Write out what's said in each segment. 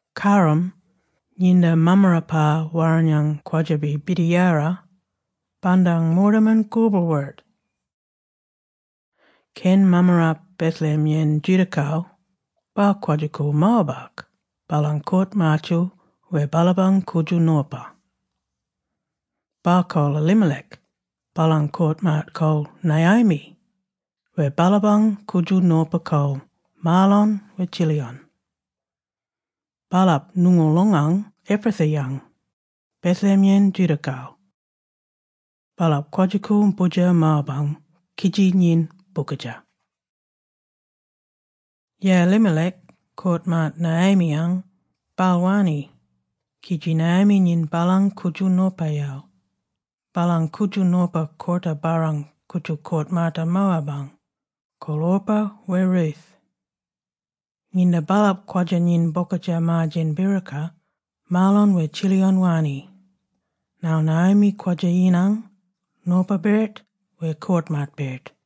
Karram, nginda Mammarapa Warrinyang kwadja-bi birdiyara, bandang moortaman koboorl-wirt. Keny mammarap Bethlehem-yen Judah-kal, baal kwadja-koorl Moab-ak baalang koort-maatyel wer baalapang koodjal nopa. Baal kol Elimelech, baalang koort-maat kol Naomi wer baalapang koodjal nopa kol Mahlon wer Chilion. Baalap ngoongoolongang Ephratha-yang, Bethlehem-yen Judah-gal. Baalap kwadja-koorl boodjer Moab-ang kidji nyin bookadja. Yeyi Elimelech, koort-maat Naomi-ang, baal wanni, kidji Naomi nyin baalang koodjal nopayel. Baalang koodjal nopa koorta-barrang koodjal koort-maata Moab-ang, kol Orpah wer Ruth. Nginda baalap kwadja-nyin bokadja maar-djen biroka, Mahlon wer Chilion wanni, ngarl Naomi kwadja-yinang, nopa-birt wer koort-maat-birt.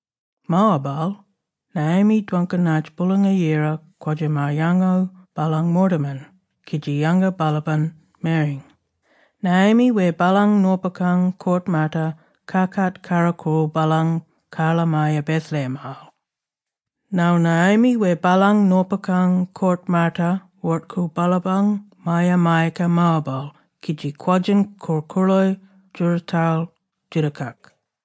Moab-al, Naomi dwangka nartj Boolanga-Yira kwadja maar-yango baalang moortaman kidji yanga baalapany mereny. Naomi wer baalang nopakang koort-maata kakat karro-koorl baalang karla-maya Bethlehem-al. Ngarl Naomi wer baalang nopakang koort-maata woort-koorl baalapang maya-mayaka Moab-al kidji kwadjin korl-koorlo djoorootal Judah-kak.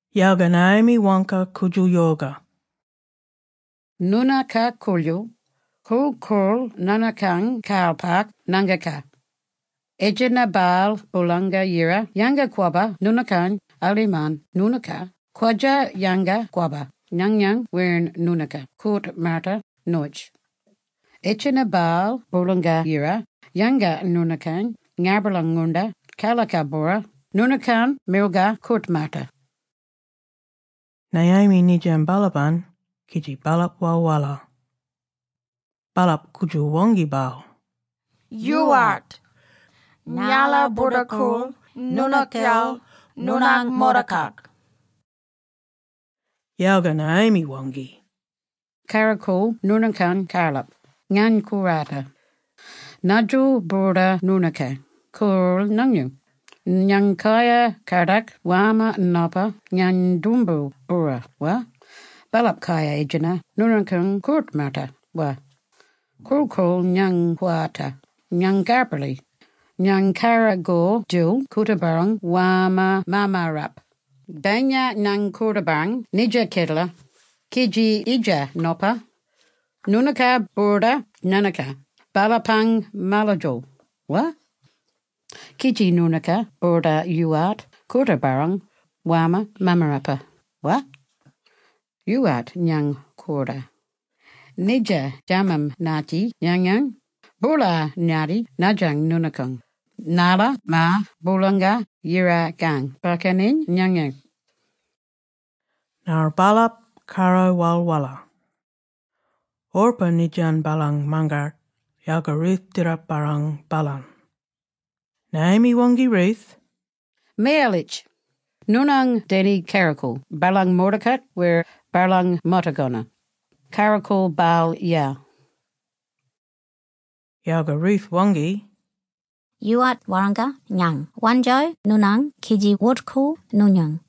Yalga Naomi waangka koodjal yoka, “Noonooka koodjal, korl-koorl noonookang karlapak ngaangkakang. Etjenna-bal Boolanga Yira yanga-kwabba noonookany alimarn noonooka kwadja-yanga-kwabba nganyany wer noonookang koort-maata noyitji. Etjenna-bal Boolanga Yira yanga noonookany ngabala-ngoonda karlaka-bwora noonookang milgar koort-maata.” Naomi nindyan baalapany, kidji baalap walwala. Baalap koodjal waangki baal, “Yoowart, ngala boorda koorl noonookyel noonang moortakak. Yalga Naomi waangki, “Karro-koorl noonookang karlap, ngany kowarta. Nadjil boorda noonookany koorl nganyel? Ngany kayar kadak warmma nopa ngany doomboo-bwora, wa? Baalap kayar etjenna noonookang koort-maata, wa? Korl-koorl, ngany kowarta. Ngany karbarli. Ngany karagor-djil koorta-barrang warmma mammarap. Bayinya ngany koorta-barrang nidja kedelak, kidji idja nopa, noonooka boorda nganaka baalapang maladjo, wa? Kidji noonooka boorda yoowart koorta-barrang warmma mammarapa, wa? Yoowart, ngany kowarta. Nidja djadam-ngatti nganyang, boola-ngatti nadjang noonookang, narla maar Bolanga-Yira-kang bakkaniny nganyany.” Ngarl baalap karro walwala. Orpah nindyan baalang mangat, yalga Ruth dirrup-barrang baalany. Naomi waangki Ruth, “Miyalitj! Noonang deni karro-koorl baalang moortakak wer baalang motogona. Karro-koorl baalyel.” Yalga Ruth waangki, “Yoowart warranga ngany wandjo noonany kidji wort-koorl noonyen.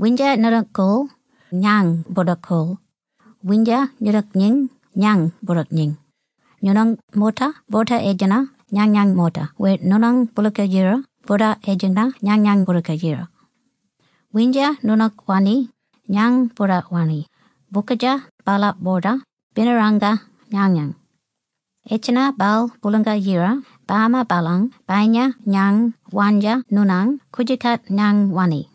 Windja noonook koorl, ngany boorda koorl; windja noonook nyin ngany boorda nyin; noonang moorta boorda etjenna nganyang moorta wer noonang Boolanga Yira boorda etjenna nganyang Boolanga Yira. Windja noonook wanni, ngany boorda wanni - bokatja baalap boorda binarangka nganyany. Etjenna-bal Boolanga-Yira bama baalany bayinya ngany wandja noonany koodjookat ngany wanni.”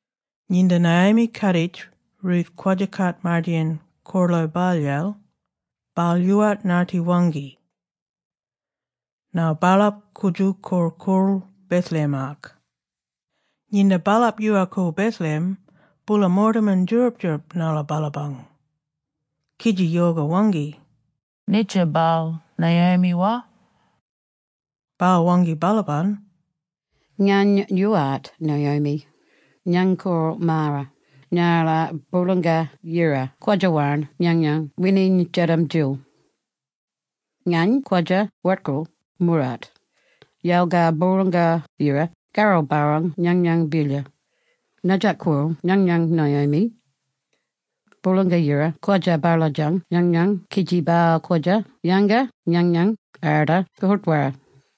Nginda Naomi kaaditj Ruth kwadja kaat-mardeyin koorlo baalyel, baal yoowart ngatti waangki. Ngarl baalap koodjal korl-koorl Bethlehem-ak. Nginda baalap yoowal-koorl Bethlehem, boola moortaman djoorab-djoorab narla baalapang, kidji yoka waangki, “Nidja baal Naomi, wa?” Baal waangki baalapany’ “Ngany yoowart Naomi, ngany kol Mara narla Boolanga Yira kwadja warn nganyang wininy djadam-djil. Ngany kwadja wort-koorl moorart, yalga Boolanga-Yira karro-barrang nganyany bilyar. Nadjak kol nganyany Naomi? Boolanga Yira kwadja baladjan nganyany kidji baal kwadja yanga nganyan arda koort-warra.”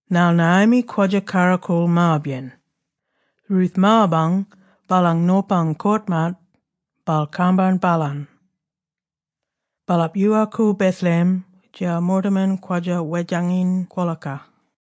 Ngarl Naomi kwadja karro-koorl Moab-yen. Ruth Moab-ang, baalang nopang koort-maat, baal kambarn baalany. Baalap yoowal-koorl Bethlehem djiyal moortaman kwadja wedjanginy kwolaka.